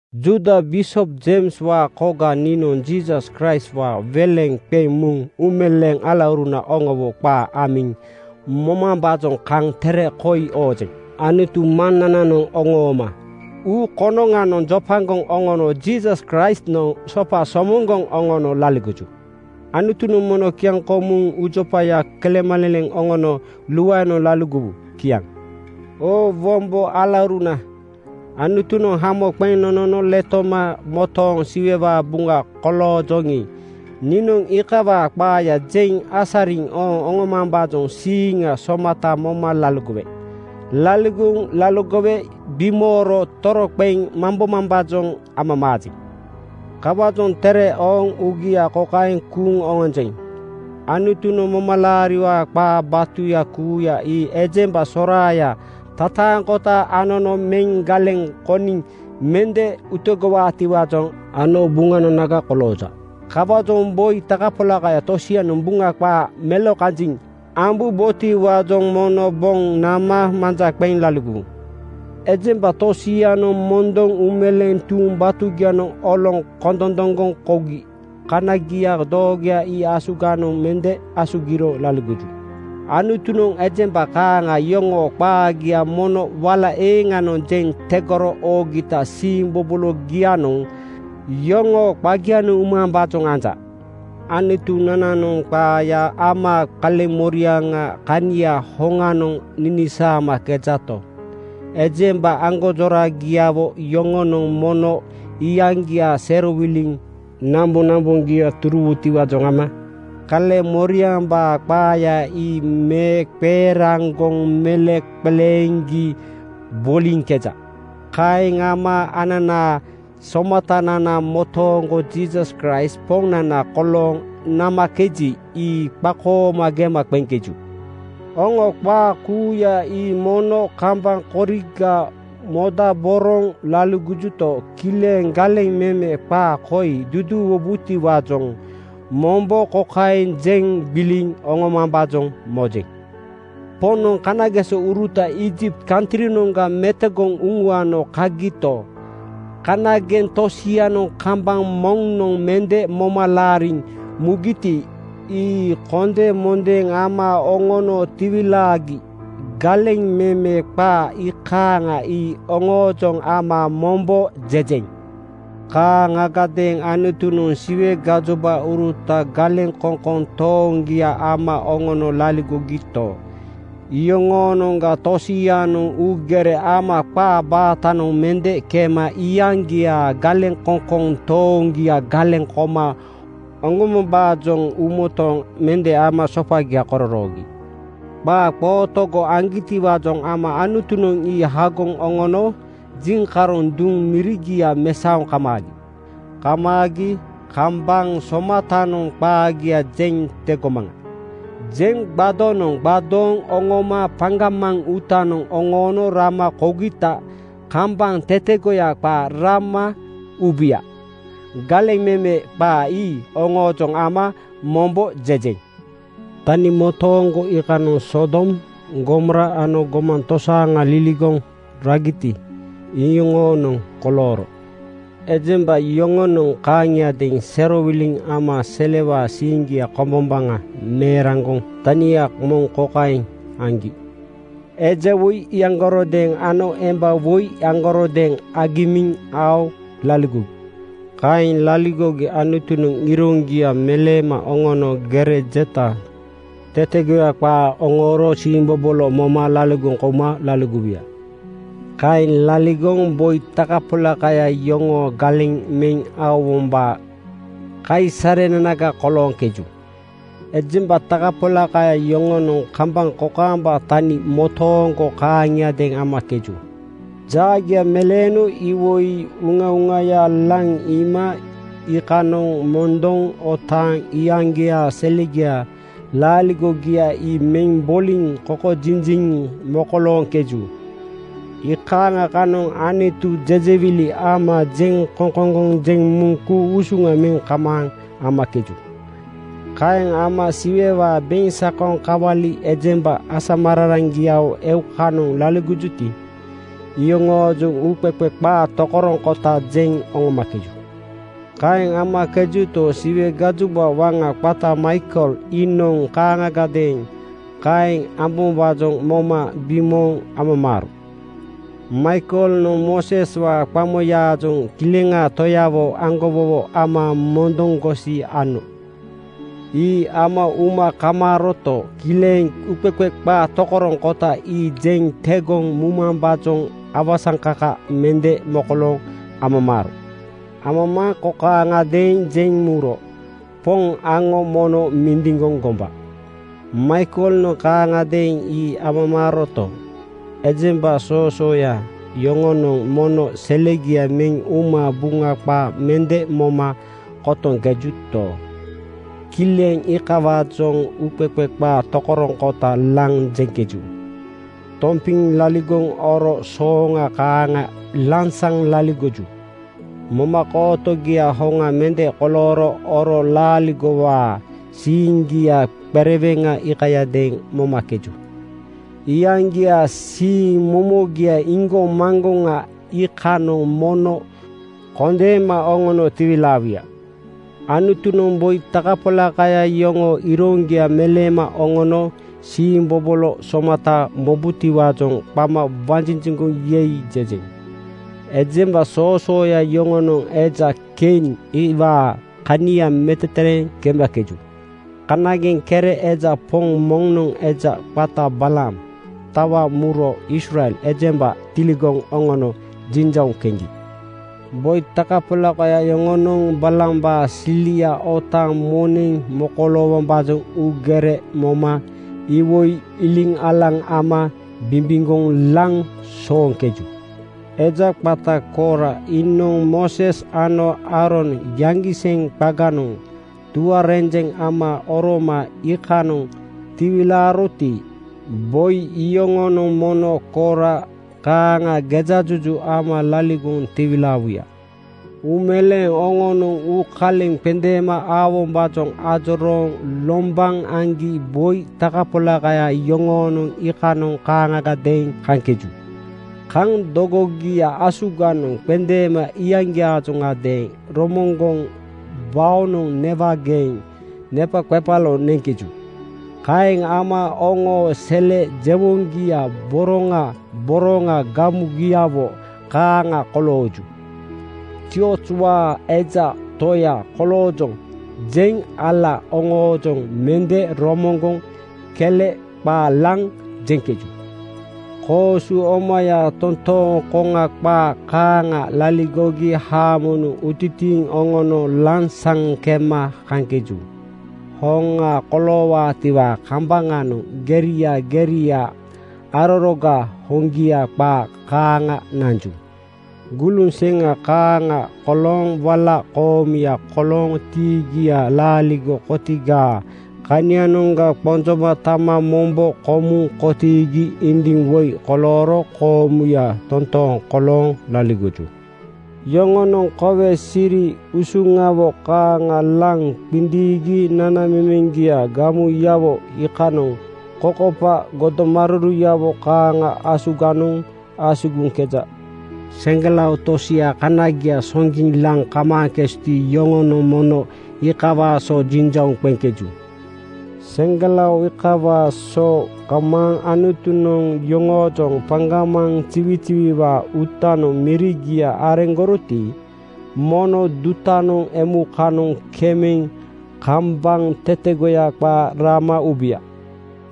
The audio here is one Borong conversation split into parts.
Juuda bisop Jeimswaa koga niinoŋ Jiisas Kraistwaa weleŋ qeŋ muŋ uumeleeŋ alauruna oŋowo qaa amiŋ mobombaajoŋ kaŋ tere koi oojeŋ. Anutu Maŋnananoŋ oŋooma uu konoŋanoŋ jopagoŋ oŋono Jiisas Kraistnoŋ sopa somoŋgoŋ oŋono laligoju. Anutunoŋ mono kiaŋkomuŋ uujopaya kelemaleleŋ oŋono luaenoŋ laligowu. Kiaŋ. Oo wombo alauruna, Anutunoŋ hamo qeŋ nonono letoma motooŋ Siwewaa buŋa koloojoŋi, niinoŋ iikawaa qaaya jeŋ asariŋ ooŋ oŋomambaajoŋ siiŋa somata moma laligowe. Laligoŋ laligowe bimooro toroqeŋ mambomambaajoŋ amamaajeŋ. Kawaajoŋ tere ooŋ uugia kokaeŋ kuuŋ oŋonjeŋ: Anutunoŋ momalaariwaa qaa batuya kuuya ii ejemba soraaya tataaŋkota anono meŋ galeŋ koniŋ mende utegowaatiwaajoŋ ano buŋananaga kolooja. Kawaajoŋ boi takapolakaya tosianoŋ Buŋa qaa melokanjiŋ ambubotiwaajoŋ mono boŋ nama manja qeŋ laligowu. Ejemba tosianoŋ mondoŋ uumeleeŋ tuuŋ batugianoŋ oloŋ kondondoŋgoŋ kougi kaniagia doogoya ii asuganoŋ mende asugiro laligoju. Anutunoŋ ejemba kaaŋa yoŋoo qaagia mono wala eeŋanoŋ jeŋ tegoro oogita siimbobologianoŋ yoŋoo qagianoŋ umambaajoŋ anja. Anutunananoŋ qaaya ama kaleŋmoriaŋaa kania hoŋanoŋ ninisaamakejato, ejemba aŋgonjoragiawo yoŋonoŋ mono iyaŋgiaa serowiliŋ namboŋnamboŋgia turuwutiwaajoŋ ama kaleŋmoriambaa qaaya ii meeqeeraŋgoŋ meleŋqeleeŋgi boliŋkeja. Kaeŋ ama ananaa Somatanana motooŋgo Jiisas Kraist Poŋnana kolooŋ namakeji, ii qakooma gema qeŋkeju. Oŋo qaa kuuya ii mono kambaŋ koriga modaboroŋ laligojuto, kileŋ galeŋ meme qaa koi duduuwubotiwaajoŋ mombo kokaeŋ jeŋ gbiliŋ oŋomambaajoŋ mojeŋ: Poŋnoŋ kanagesouruta Iijipt kantrinoŋga metogoŋ uŋuano kagito, kanageŋ tosianoŋ kambaŋ moŋnoŋ mende moma laariŋ mugiti, ii kondemondeeŋ ama oŋono tiwilaagi. Galeŋ meme qaa iikaaŋa ii oŋoojoŋ ama mombo jejeŋ. Kaaŋagadeeŋ Anutunoŋ Siwe gajobauruta galeŋkoŋkoŋ tooŋgia ama oŋono laligogito, iyoŋoonoŋga tosianoŋ uugere ama qaa baatanoŋ mende kema iyaŋgiaa galeŋkoŋkoŋ tooŋgia galeŋ koma oŋombombaajoŋ uumotooŋ mende ama sopagia kororoogi. Qaa qootogo aŋgitiwaajoŋ ama Anutunoŋ ii hagoŋ oŋono jiŋkaroŋ duŋ mirigia mesaoŋ kamaagi. Kamaagi “Kambaŋ somatanoŋ qaagia jeŋ tegomaŋa,” jeŋ gbadonoŋ gbadooŋ oŋoma paŋgamaŋ uutanoŋ oŋoono rama kougita kambaŋ tetegoya qaa rama ubuya. Galeŋ meme qaa ii oŋoojoŋ ama mombo jejeŋ. Tani motooŋgo iikanoŋ Sodom, Gomora ano gomaŋ tosaaŋa liligoŋ ragiti, iyoŋoonoŋ kolooro. Ejemba yoŋonoŋ kaaŋiadeeŋ serowiliŋ ama selewaa siiŋgia kombombaŋa meeraŋgoŋ tania moŋ kokaeŋ aŋgi: Eja woi iyaŋgarodeeŋ ano emba woi iyaŋgarodeeŋ agimiŋ aoŋ laligogi. Kaeŋ laligogi Anutunoŋ iroŋgia meleema oŋono gere jeta tetegoya qaa oŋooro siimbobolo moma laligoŋ kouma laligowuya. Kaeŋ laligoŋ boi takapolakaya yoŋoo galeŋ meŋ aowombaa kaisarenanaga kolooŋkeju. Ejemba takapolakaya yoŋonoŋ kambaŋ kokaamba tani motooŋgo kaaŋiadeeŋ amakeju. Jaagia meleeno iwoi uŋauŋaya laŋ iima iikanoŋ mondoŋ otaaŋ iyaŋgiaa selegiaa laaligogia ii meŋ boliŋ kokojinjiŋ mokolooŋkeju. Iikaaŋa kanoŋ Anutu jejewili ama jeŋkoŋkoŋgoŋ jeŋ muŋ ku-usuŋa meŋ kamaaŋ amakeju. Kaeŋ ama Siwewaa beŋsakoŋ kawali ejemba asamararaŋgiawo eukanoŋ laligojuti, iyoŋoojoŋ uuqeqe qaa tokoroŋkota jeŋ oŋomakeju. Kaeŋ amakejuto, Siwe gajoba waŋa qata Maikel iinoŋ kaaŋagadeeŋ kaeŋ amambaajoŋ moma bimooŋ amamaaro. Maikelnoŋ Mooseswaa qamoyaajoŋ Kileŋaa Toyawo aŋgowowo ama mondoŋgosi ano. Ii ama uma kamaaroto, kileŋ uuqeqe qaa tokoroŋkota ii jeŋ tegoŋ mumambaajoŋ awasaŋkaka mende mokolooŋ amamaaro. Amamaaŋ kokaaŋadeeŋ jeŋ muro, “Poŋ aŋo mono mindiŋgoŋ gomba.” Maikelnoŋ kaaŋagadeeŋ ii amamaaroto, ejemba soosooya yoŋonoŋ mono selegia meŋ uma Buŋa qaa mende moma kotoŋkejuto, kileŋ iikawaajoŋ uuqeqe qaa tokoroŋkota laŋ jeŋkeju. Tompiŋ laligoŋ oro sooŋa kaaŋa lansaŋ laligoju. Momakootogia hoŋa mende kolooro oro laaligowaa siiŋgia qereweŋa iikayadeeŋ momakeju. Iyaŋgiaa siiŋ momogia iŋgoŋmaŋgoŋa iikanoŋ mono kondeema oŋono tiwilaawuya. Anutunoŋ boi takapolakaya yoŋoo iroŋgia meleema oŋono siimbobolo somata mobutiwaajoŋ qama wanjinjiŋgoŋ “Yei!” jejeŋ. Ejemba soosooya yoŋonoŋ eja Kein (Kain) iwaa kania metetereeŋ kemakeju. Kanageŋ kere eja poŋ moŋnoŋ eja qata Balaam tawa muro Israel ejemba tiligoŋ oŋono jiŋjauŋ keŋgi. Boi takapolakaya yoŋonoŋ Balaambaa silia otaaŋ moneŋ mokoloowombaajoŋ uugere moma iwoi iliŋalaŋ ama bimbiŋgoŋ laŋ sooŋkeju. Eja qata Koora iinoŋ Mooses ano Aaron yaŋgiseŋ qaganoŋ tuarenjeŋ ama oroma iikanoŋ tiwilaaroti, boi iyoŋonoŋ mono Koora kaaŋa gejajuju ama laligoŋ tiwilaawuya. Uumeleeŋ oŋonoŋ uukaleŋ qendeema aowombaajoŋ ajorooŋ lombaŋ aŋgi boi takapolakaya yoŋonoŋ iikanoŋ kaaŋagadeeŋ kaŋkeju. Kaŋ dogogia asuganoŋ qendeema iyaŋgiaajoŋadeeŋ romoŋgoŋ baonoŋ newageeŋ nepaqepalo neŋkeju. Kaeŋ ama oŋoo sele jewoŋgia boroŋa boroŋa gamugiawo kaaŋa kolooju. “Ziozwaa eja toya koloojoŋ,” jeŋ ala oŋoojoŋ mende romoŋgoŋ kele qaa laŋ jeŋkeju. Koosu omaya toontooŋ koŋa qaa kaaŋa laligogi haamonoŋ utitiiŋ oŋono lansaŋ kema kaŋkeju. Hoŋa koloowaatiwaa kambaŋanoŋ geria geria araroga hoŋgia qaa kaaŋa nanju. Guluŋ seŋa kaaŋa kolooŋ wala koomuya kolooŋ tiigia laaligo kotigaa kanianoŋga qonjoma tama mombo komuŋ kotiigi indiŋ woi kolooro koomuya totooŋ kolooŋ laligoju. Yoŋonoŋ kowe siri usuŋawo kaaŋa laŋ qindiiŋgi nanamemeŋgia gamuyawo iikanoŋ kokopa godomaruruyawo kaaŋa asuganoŋ asugiŋkeja. Seŋgelao tosia kanagia soŋgiŋ laŋ kamaaŋkejuti, yoŋonoŋ mono iikawaa so jiŋjauŋ qeŋkeju. Seŋgelao iikawaa so kamaaŋ Anutunoŋ yoŋoojoŋ paŋgamaŋ ziwiziwiwaa uutanoŋ mirigia areŋgoroti, mono dutanoŋ emukanoŋ kemeŋ kambaŋ tetegoya qaa rama ubuya.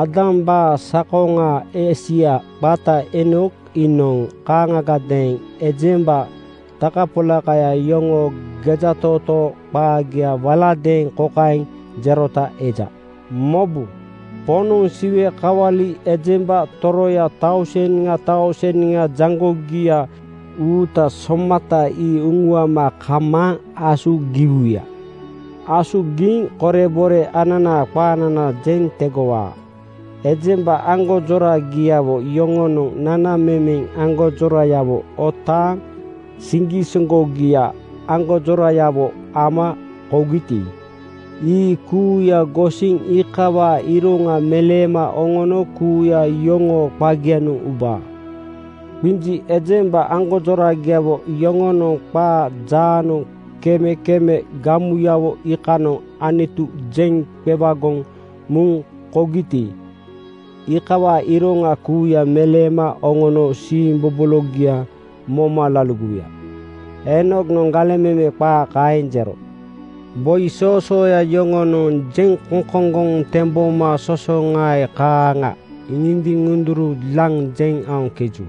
Aadambaa sakoŋaa esia qata Eenok iinoŋ kaaŋagadeeŋ ejemba takapolakaya yoŋoo gejatootoo qaagia waladeeŋ kokaeŋ jerota eja: “Mobu, Poŋnoŋ Siwe kawali ejemba toroya tauseŋa tauseŋa jaŋgogia uuta somata ii uŋuama kamaaŋ asugiwuya. Asugiŋ korebore ananaa qaanana jeŋ tegowaa. Ejemba aŋgonjoragiawo yoŋonoŋ nanamemeŋ aŋgonjorayawo otaaŋ siŋgisoŋgogia aŋgonjoragiawo ama kougiti, ii kuuya gosiŋ iikawaa iroŋa meleema oŋono kuuya yoŋoo qagianoŋ ubaa. Qinji ejemba aŋgonjoragiawo yoŋonoŋ qaa jaanoŋ kemekeme gamuyawo iikanoŋ Anutu jeŋ qewagoŋ muŋ kougiti, iikawaa iroŋa kuuya meleema oŋono siimbobologia moma laligowuya.” Eenoknoŋ galeŋ meme qaa kaeŋ jero. Boi soosooya yoŋonoŋ jeŋkoŋkoŋgoŋ temboma sosoŋae kaaŋa ŋindiŋ-ŋunduru laŋ jeŋ aoŋkeju.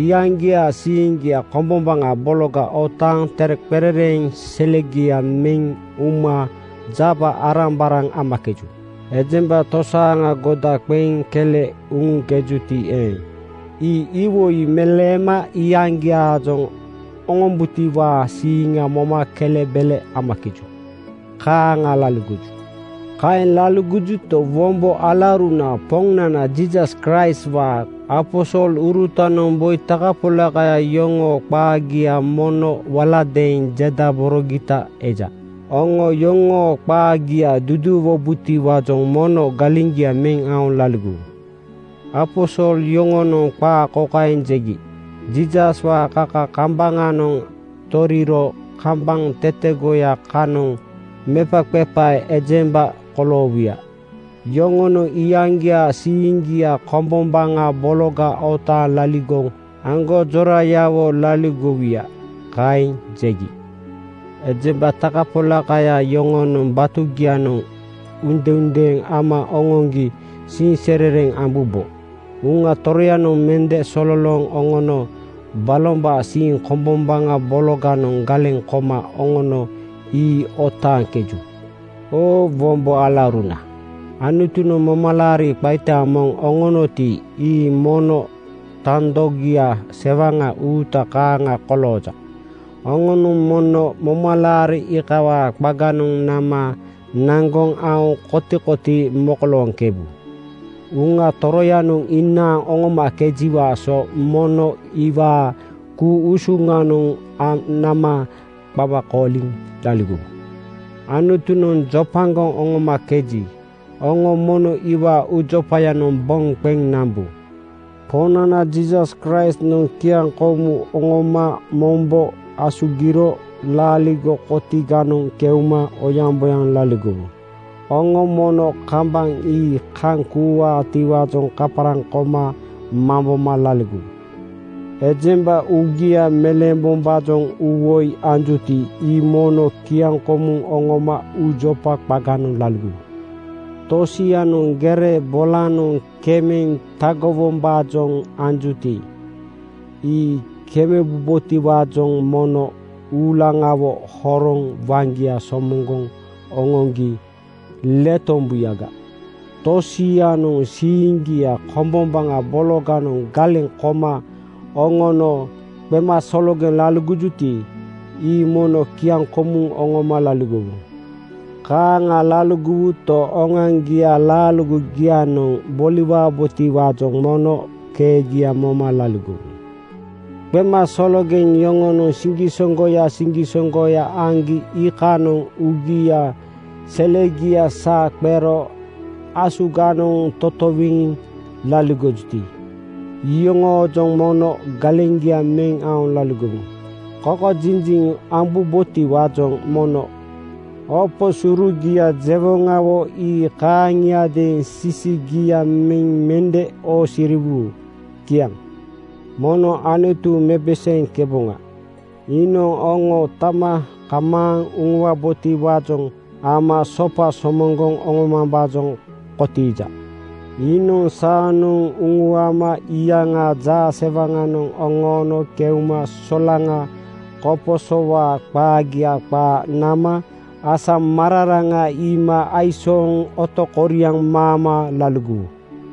Iyaŋgiaa siiŋgia kombombaŋa bologa otaaŋ tereqerereeŋ selegia meŋ uma jaba-arambaraŋ amakeju. Ejemba tosaaŋa goda qeŋ kele uŋujuti eeŋ, ii iwoi meleema iyaŋgiaajoŋ oŋombutiwaa siiŋa moma kelebele amakeju. Kaaŋa laligoju. Kaeŋ laligojuto, wombo alauruna, Poŋnana Jiisas Kraistwaa aposolurutanoŋ boi takapolakaya yoŋoo qaagia mono waladeeŋ jedaborogita eja. Oŋo yoŋoo qaagia duduuwubotiwaajoŋ mono galeŋgia meŋ aoŋ laligowu. Aposol yoŋonoŋ qaa kokaeŋ jegi, “Jiisaswaa kaka kambaŋanoŋ toriro kambaŋ tetegoya kanoŋ mepaqepae ejemba koloowuya. Yoŋonoŋ iyaŋgiaa siiŋgia kombombaŋa bologa otaaŋ laaligo aŋgonjorayawo laligowuya.” Kaeŋ jegi. Ejemba takapolakaya yoŋonoŋ batugianoŋ uudendeeŋ ama oŋoŋgi siiŋserereŋ ambubo. Uŋa Toroyanoŋ mende sololooŋ oŋono balombaa siiŋ kombombaŋa bologanoŋ galeŋ koma oŋono ii otaaŋkeju. Oo wombo alauruna, Anutunoŋ momalaari qaita moŋ oŋonoti, ii mono tandogia sewaŋa uuta kaaŋa kolooja. Oŋonoŋ mono momalaari iikawaa qaganoŋ nama naŋgoŋ aoŋ kotikotii mokolooŋkebu. Uŋa Toroyanoŋ inaaŋ oŋomakejiwaa so mono iwaa ku-usuŋnoŋ nama qama kooliŋ laligowu. Anutunoŋ jopagoŋ oŋomakeji, oŋo mono iwaa uujopayanoŋ boŋ qeŋ nambu. Poŋnana Jiisas Kraistnoŋ kiaŋkoomu oŋoma mombo asugiro laaligo kotiganoŋ keuma oyaŋboyaŋ laligowu. Oŋo mono kambaŋ ii kaŋ kuuwaatiwaajoŋ kaparaŋ koma mamboma laligowu. Ejemba uugia meleembombaajoŋ uuwoi anjuti, ii mono kiaŋkomuŋ oŋoma uujopa qaganoŋ laligowu. Tosianoŋ gere bolanoŋ kemeŋ tagowombaajoŋ anjuti, ii kemebubotiwaajoŋ mono uulaŋawo horoŋ waŋgia somoŋgoŋ oŋoŋgi letombuyaga. Tosianoŋ siiŋgia kombombaŋa bologanoŋ galeŋ koma oŋono qemasologeŋ laligojuti, ii mono kiaŋkomuŋ oŋoma laligowu. Kaaŋa laligowuto, oŋoaŋgiaa laaligogianoŋ boliwabotiwaajoŋ mono keegia moma laligowu. Qemasologeŋ yoŋonoŋ siŋgisoŋgoya siŋgisoŋgoya aŋgi iikanoŋ uugia selegia saa qero asuganoŋ totowiŋ laligojuti, iyoŋoojoŋ mono galeŋgia meŋ aoŋ laligowu. Kokojinjiŋ ambubotiwaajoŋ mono opo surugia jewoŋawo ii kaaŋiadeeŋ sisigia meŋ mende oosiriwu. Kiaŋ. Mono Anutu mepeseeŋkeboŋa. Iinoŋ oŋo tama kamaaŋ uŋuwabotiwaajoŋ ama sopa somoŋgoŋ oŋomambaajoŋ kotiija. Iinoŋ saanoŋ uŋuama iyaŋaa jaasewaŋanoŋ oŋoono keuma solaŋa koposowaa qaagia qaa nama asamararaŋa iima aisooŋ otokoriaŋ maama laligowu.